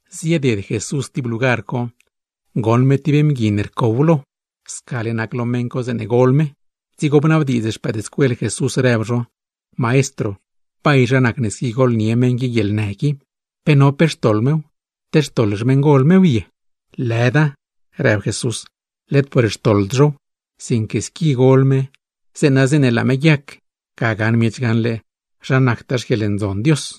Zieded Jesús tib lugar co, goṉ me tib mgui ne rcow lo, scale nac lo meṉ co zeeṉe gol me. Dzigo bnabdiidz xpëëdscuel Jesús rëb zho: ―Maestro, ¿bay zha nacne squi golnie meṉ qui guieḻnë qui? ¿Pe no pe xtoḻ mew, te xtoḻ xmeṉgol mew ye? ―Lëda ―rëb Jesús―, led por xtoḻd zhow; sinque squi gol me, zeeṉa zeeṉe laa me guiac, ga gaṉ miech gaṉle zha nactaa grë ncuaaṉe ruṉ Dios.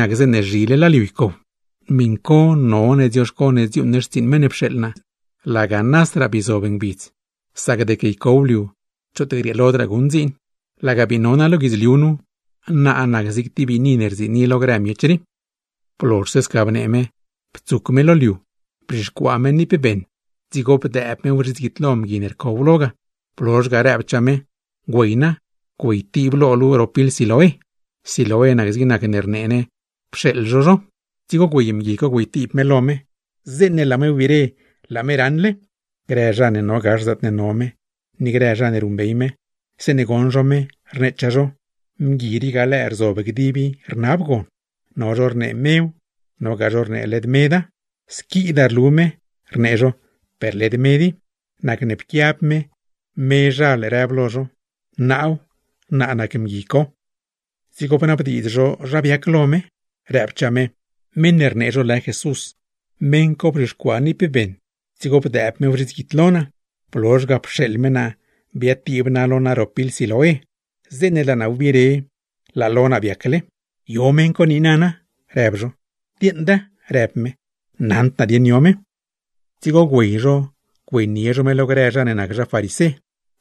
Zhile laa liu ycow. None dzioxco ne dziuuṉ ne xtsiiṉ meṉ ne pxeeḻ naa laga nasraa bii zob ngbidz, sac deque ycow liu choot grieelodraa guṉ dziin. Laga bii no naa lo guidzliu rii, naa nac zig tib biini ne rziini lo grë miech rii. Blozhse sca bnee me, ptsuc me lo liu, bzhixcuaa me niip beṉ, dzigo bdëëb mew zhits guidlo mgui ne rcow lo ga; blozh ga, rëbchaa me: ―Güey na, güeytiib lo luu ro pil Siloé. (Siloé nac zig nacne rnee ne Pxeeḻ zho zho.) Dzigo güey mgui co güeytiib me lo me, zeeṉe laa me wbire laa me raṉle. Grë zha ne no gax zaatne no me, ni grë zha ne ruṉbey me; zeeṉe goṉ zho me, rneechaa zho: ―¿Mgui rii ga lëë rzob gdib i rnab gon? No zho rnee mew, nogaa zho rnee led meda. ―Squidaa rlu me ―rnee zho―, per led med i. Nacne pquiab me mezhal rëb lo zho: ―Naaw, naa nac mgui co. Dzigo bnabdiidz zho zha biac lo me. Rëbchaa me: ―Meṉ ne rnee zho lë Jesús, meṉ co bzhixcuaa niip beṉ dzigo bdëëb mew zhits guidlo naa, blozh ga pxeeḻ me naa biatiib naa lo naa ro pil Siloé; zeeṉe laa naa wbire laa lo naa biacle. ―¿Yo meṉ co niina na? ―rëb zho. ―Dieeṉda ―rëb me―, naṉd naa dieṉ yo me. Dzigo güey zho güeynie zho me lo grë zha ne nac zha farisé;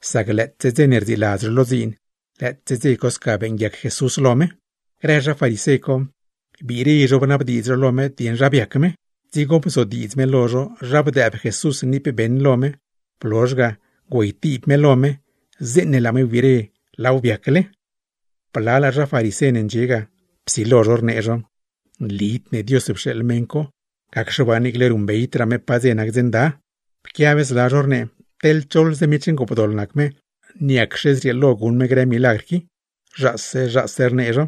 sac lëëtse dze ne rdziiladz zho lo dziin, lëëtse dze co sca beeṉguiac Jesús lo me. Grë zha farisé co, biire zho bnabdiidz zho lo me dieṉ zha biac me; dzigo bzodiidz me lo zho zha bdëëb Jesús niip beṉ lo me, blozh ga güeytiib me lo me, zeeṉe laa me wbire laaw biacle. Blalaa zha farisé ne ndxie ga, psilo zho rnee zho: ―Nlid ne Dios pxeeḻ meṉ co, gacxe waa niicle ruṉbeydraa me pa dze nac dze nda. Pquiab zla zho rnee: ―Teḻ choḻze miech ngoopdoḻ nac me, ¿niacxe zrieelo guṉ me grë milagr qui? Zhaase zhaase rnee zho.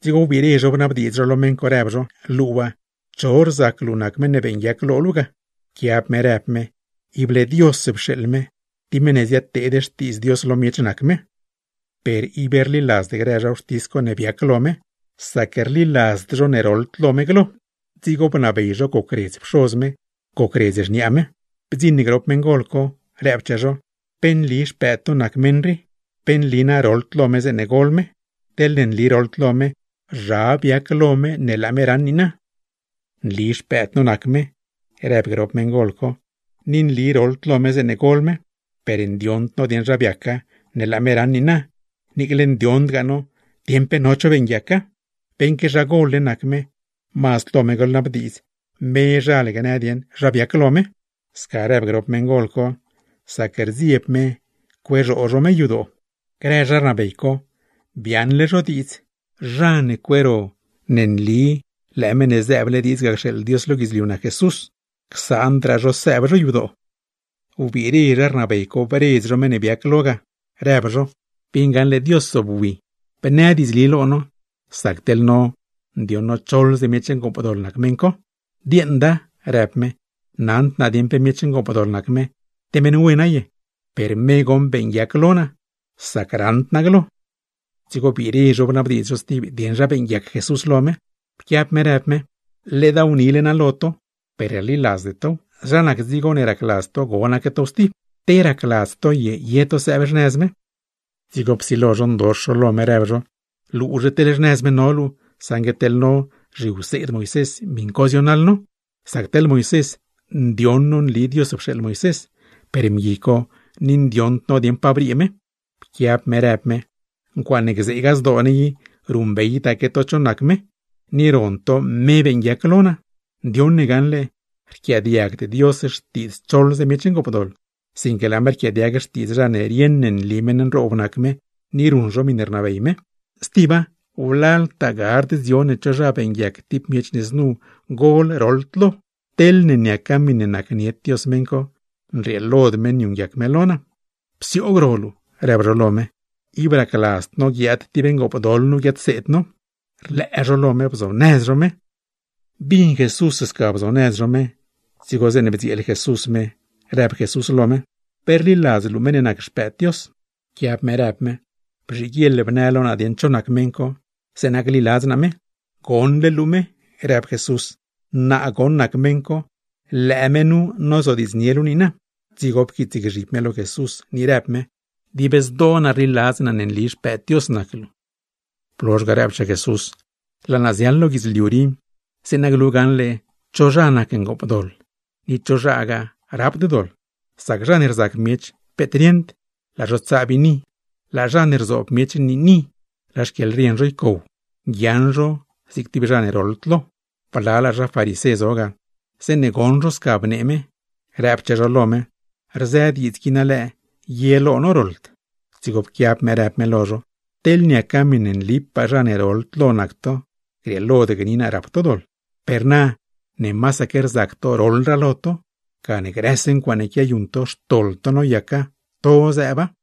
Dzigo wbiire zho bnabdiidz zho lo me, rëb zho: ―Luu waa, ¿cho rzac luu nac meṉ ne beeṉguiac lo luu ga? Pquiab me rëb me: ―Ible Dios pxeeḻ me. Tib meṉ ne ziadteed xtiidz Dios lo miech nac me. Per ib rliladzd grë zha wxtis co ne biac lo me, sac rliladzd zho ne roḻd lo me glo; dzigo bnabey zho gocredz pxoz me, gocredz xniaa me. Bdziṉ grop meṉgol co, rëbchaa zho: ―¿Pe nli xpëëd to nac meṉ rii? ¿Pe nli na roḻd lo me zeeṉe gol me? Teḻ nli roḻd lo me, ¿zha biac lo me ne laa me raṉ niina? ―Nli xpëëd no nac me ―rëb grop meṉgol co―. Ni nli roḻd lo me zeeṉe gol me; per ndioṉd no dieṉ zha biaca ne laa me raṉ niina, niicle ndioṉdgaa no dieṉ pe no cho beeṉguiaca. Beṉque zha gol-le nac me, mazd lo me goḻnabdiidz, mezhal gnë dieṉ zha biac lo me. Sca rëb grop meṉgol co, sac rdzieb zho griee zho xyadoo zho. Biaaṉle grë zha rnabey co diidz: zha ne guiab Jesús nac Meṉ ne zëëble diidz ga cxeeḻ Dios lo guidzliu; csaandraa zho sëëb zho yadoo. Wbiire zho bredz zho meṉ ne biac lo ga, rëb zho: ―Bieṉ gaṉle Dios zobwi, bnë diidzli lo no; sac teḻ no ndioṉ no choḻze miech ngoopdoḻ nac meṉ co. ―Dieeṉda ―rëb me―. Naṉd naa dieṉ pe miech ngoopdoḻ nac me, te meṉ wena ye. Per me goṉ beeṉguiac lo naa, sac roḻd lo naa glo. Dzigo biire zho bnabdiidz zho stib dieṉ zha beeṉguiac Jesús lo me. Pquiab me rëb me: ―Ledaaw nile naa lo to, per ib rliladzde tow. ¿Zha nac dzigo ne racladz to gonaque tow stib? ¿Te racladz to ye, ye to sëëb xnëz me? Dzigo psilo zho ndox zho lo me, rëb zho: ―Luuzhe teḻ xnëz me no luu, saṉgue teḻ no zhiwseed Moisés, miṉ co zionaḻ no. Sac teḻ Moisés, ndioṉ no nli Dios pxeeḻ Moisés, per mgui co ni ndioṉd no dieṉ pa briee me. Pquiab me rëb me: ―¡Ncuaaṉe gzeegaa zdoo ne i ruṉbeydaque to cho nac me, ni ron to me beeṉguiac lo naa! Ndioṉ ne gaṉle rquiaadiagd Dios xtiidz choḻze miech ngoopdoḻ, sinque laa me rquiaadiag xtiidz zha ne rieṉ ne nli meṉ nroob nac me, ni ruṉ zho miṉe rnabey me. Stiba, wlaltaa gard dzion ne cho zha beeṉguiac lo tib miech ne znu gol roḻd lo. Teḻne niaca miṉe nacnied Dios meṉ co, nrieelod me niuṉguiac me lo naa. ―¡Psioog ro luu! ―rëb zho lo me―. ¡Ib racladzd no guiaad tib ngoopdoḻ nu guiadseed no! Horco wbig zho, blee zho me ga. Bin Jesús sca blee zho me ga, dzigo zeeṉe bdzieel Jesús me, rëbchaa Jesús lo me: ―¿Pe rliladz luu meṉ ne nac Xpëëd Dios? Pquiab me rëb me: ―Bzhiguieḻ bnë lo naa dieṉ cho nac meṉ co, zeeṉa gliladz naa me. ―Goṉle luu me ―rëb Jesús―. Naa goṉ nac meṉ co, lëë me nu nozodiidznie luu niina. Dzigo pquiitsgzhib me lo Jesús, ni rëb me: ―Dib zdoo naa rliladz naa ne nli Xpëëd Dios nac luu. Blozh ga rëbchaa Jesús: ―Laa naa ziaḻ lo guidzliu rii, zeeṉa glu dieṉ cho rap doḻ, dieṉ chogaa rapd doḻ; sac zha ne rzac miech peet rieṉd, laa zho tsaa biini; laa zha ne rzoob zho niini, laa xquieḻrien zho ycow, guiaaṉ zho zig tib zha ne roḻd lo. Blalaa zha farisé zo ga, zeeṉe bin zho sca rëb me, rëbchaa zho lo me: ―¿Rzë diidz qui na lëë ye lo no roḻd? Dzigo pquiab me rëb me lo zho: ―Teḻ niaca miṉe nlipaa zha ne roḻd lo nac to, grieelod gni naa rap to doḻ. Per na, ne masaque rzac to roḻraa lo to, gane grëse ncuaaṉe quiayuṉ to xtoḻ to noyaca, to zëëba.